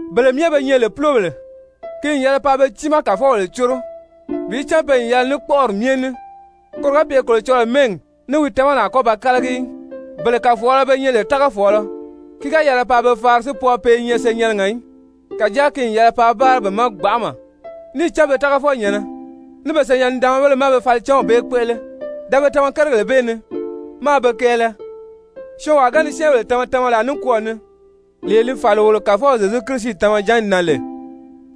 Bele myɛ be nyɛ lè púlobèle, ki n yɛlɛ paa be tiimaa kàfɔbèle córo bi cán pe n yɛlɛ ní kpɔ́ʔɔri myɛ ní, koro ga pye Kolocɔlɔɔ mɛ́ɛgi ní wi tamani a kɔ́ ba kálagi í. Bele kàfɔɔlɔ be nyɛ lè tágafɔɔlɔ, ki ga yɛlɛ paa be faari si pwɔɔ pe i nyɛ senyɛnnɛgɛ í, kàjáa ki n yɛlɛ paa báara be ma gbanʔama, níì cán be tágafɔnyɛ̀nnɛ, ní be senyɛn-nidaanmabéle má be falicanw bee kpéʔele. Tama-váanagèle ní lɔ́ri wodelere Da be tama kérigèle bee ni, máā be kɛɛlɛ. Syɔɔnwaa ga ni syɛ́ɛnbèle tama tamalaa nikwɔɔ ni, lee li fàli wolo Kàfɔw Zyezu Kirisi tamajanni na lè,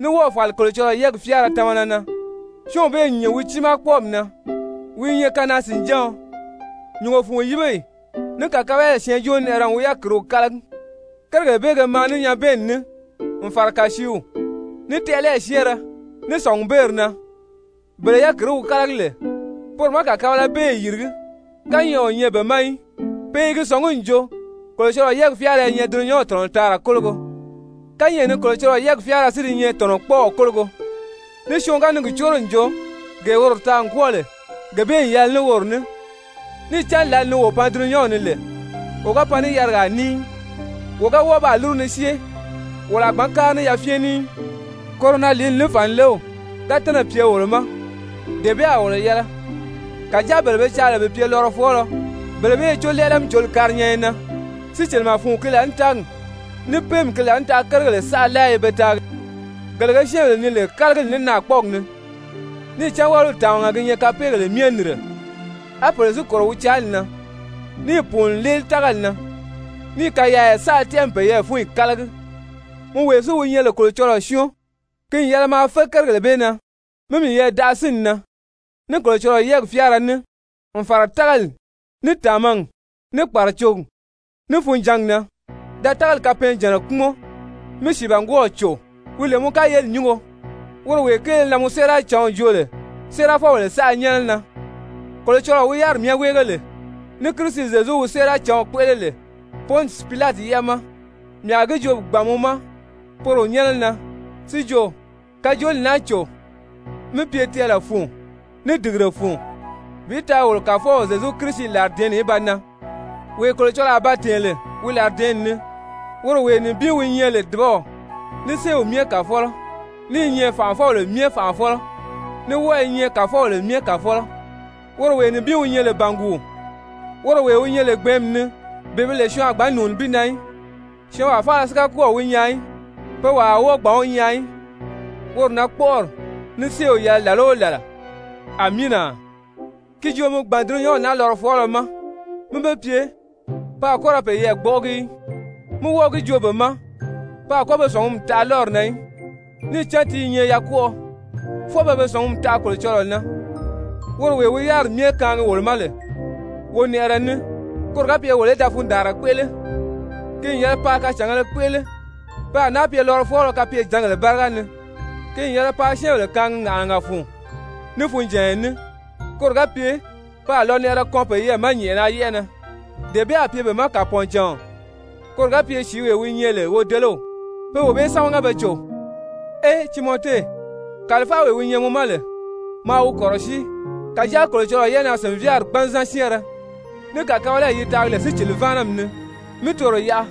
ní wɔ́ɔ̀ fàli Kolocɔlɔɔ yɛ́ɛgi fyáara tamana na, syɔ́ɔnw bee n nyìn wi tiimaa kpɔ́ɔmi na, wi i nyɛ kanaa-sìnjáɔn. Nyùngo fun yíbeyi ní kàkabalayi syɛɛnjóonɛʔɛrɛ n wi yákiriw kálagi. Kérigèle bee ge maa ní nyabɛɛnni ní n fàra kàsiiw, ní tɛʔɛlɛyi syɛ́ɛnrɛ, ní sɔ̀ngubeeri na. Bele yákirii wi kálagi lè, poro má kàkabalabeeyi yìrigí, kányɛʔɛ o nyɛ be ma í, pe i gi sɔ̀ngí n jo Kolocɔlɔɔ yɛ́ɛgi fyáara i nyɛ dulunyanw tɔ̀nɔtaara kólogo. Kányɛʔɛ ni Kolocɔlɔɔ yɛ́ɛgi fyáara si di nyɛ tɔ̀nɔkpɔɔw kólogo, ní syɔɔn ga ni gi córo n jo gee woro taa n kwɔ́ɔ lè, gee bee n yɛlɛ ní woro ní. Níì cán lǎli ni wo pan dulunyanw ni lè, wo ga pan ní yarigaa ní í, wo ga wɔ́ɔ baa lúru ni syée, wolo a gbǎn kári ní yafyɛn ní í. Koro na lìíli ní fànilew ga tɛ́nɛ̀ pye wolo ma, dee bee a wolo yɛlɛ. Kàjáa bele be caa lè bi pye lɔrɔfɔɔlɔ, bele bee i có lɛ́ɛlɛ-mí-cǒli karinyanya na, sícilimɛ fun ki laànitaagi ní péemi ki laànitaʔa kérigèle saʔa láa i be taagi, gele ge syɛ́ɛnbèle nii lè kálagili ní naakpɔɔgi ni. Níì cán wáliw tàmaga gi nyɛ kapeegèle myɛ nìnre, á pèle si kòro wi caali na, níì pùuni n léeli tágali na, níì kayaaya saʔa tɛ́ʔɛ n peyɛɛ fúnyi kálagi. Mɔ wee si wi nyɛ lè Kolocɔlɔɔ syɔ́ɔn, ki n yɛlɛ maa fé kérigèle bee na, mí miyɛɛ daʔa sínni na, ní Kolocɔlɔɔ yɛ́ɛgi fyáara ní, n fàra tágali, ní tàmagi, ní kpàracogi, ní funjǎngi na. Da tágali kapɛɛnjànna kpúmɔn, mí sìibangwɔɔw cò wi lè mɔ kayeli nyúngo, woro wee kéele na mɔ séeracǎnw joo lè séerafɔbèle saʔa nyɛ́nɛ na. Kolocɔlɔɔ wi yáriri myɛ wéege lè, ní Kirisi Zyezu wi séeracǎnw kpéʔele lè Pɔnsi Pilati yɛ́ʔɛ ma, mii a gi joo bi gbàn mɔ ma poro nyɛ́nɛ na si jo, kajooli naa cò mí pye tɛɛlɛ fun, ní dìgire fun bi taa wolo Kàfɔw Zyezu Kirisi làridɛ̀ɛ́nni í ba nan, wee Kolocɔlɔɔ a ba tɛ̀ɛn lè wi làridɛɛnni ni, woro wee nibin wi nyɛ lè dùbaw, ní séew myɛ Kàfɔlɔ, ní i nyɛ fànʔafɔbèle myɛ Fànʔafɔlɔ, ní wɔ́ɔ i nyɛ kàfɔbèle myɛ Kàfɔlɔ, woro wee nibin wi nyɛ lè bànguu, woro wee wi nyɛ lè gbɛ̀ɛ́nmi ni bee bi lè syɔɔn a gbǎn nùuni bi na í, syɔɔnwaa faala si ga kɔ́ɔ̀ wi nyaa í, pe wàa a wɔ́ɔ gbǎn wi nyaa í, woro na kpɔ̀ʔɔrɔli ní séew yɛlɛ làla o làla! Amiina. Ki joo mi gbàn dulunyanw naa lɔrɔfɔɔlɔ ma mí be pye, pe a kɔ́ ra peyɛɛ gbɔ́ʔɔgi í, mí wɔ́ɔ gi joo be ma pe a kɔ́ be sɔ̀ngumi taʔa lɔ́ri na í, níì cán ti i nyɛ yakwɔʔɔ, fwɔɔ pe be sɔ̀ngumi taʔa Kolocɔlɔɔ na, woro wee wi yáriri myɛ kaangi wolo ma lè wonɛʔɛrɛ ní, koro ga pye wolo í da fundaanra kpéʔele. Ki n yɛlɛ paa kacàngēle kpéʔele, pe a náa pye lɔrɔfɔɔlɔ kapyejǎngèle báriga ni, ki n yɛlɛ paa syɛ́ɛnbèle kaangi ŋàʔanaga fun, ní funjànya ní, koro ga pye pe a lɔnɛʔɛrɛ kɔn peyɛɛ ma nyɛ̀ʔɛna yɛ́ʔɛ na, dee bee a pye be ma kàpɔɔncàɔn, koro ga pye sìíwee wi nyɛ lè wodelew, pé wee bee sámaga be cò. Ee Timɔte, kàlifawee wi nyɛ mɔ ma lè, maa wi kɔ̀rɔsíi, kàjáa Kolocɔlɔɔ yɛ́ʔɛnaa-sìnvyaari gbanzan syɛ́ɛnrɛ, ní kàkabalayi yi taagi lè sícili-váanami ni, mi toro yaʔa,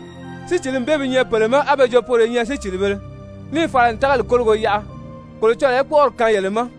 sícilimi bee bi nyɛ pèle ma, á be jo poro i nyɛ sícilibēle, níì fala n tágali kólogo yaʔa. Kolocɔlɔɔ í kpɔ́ʔɔri kaan yele ma!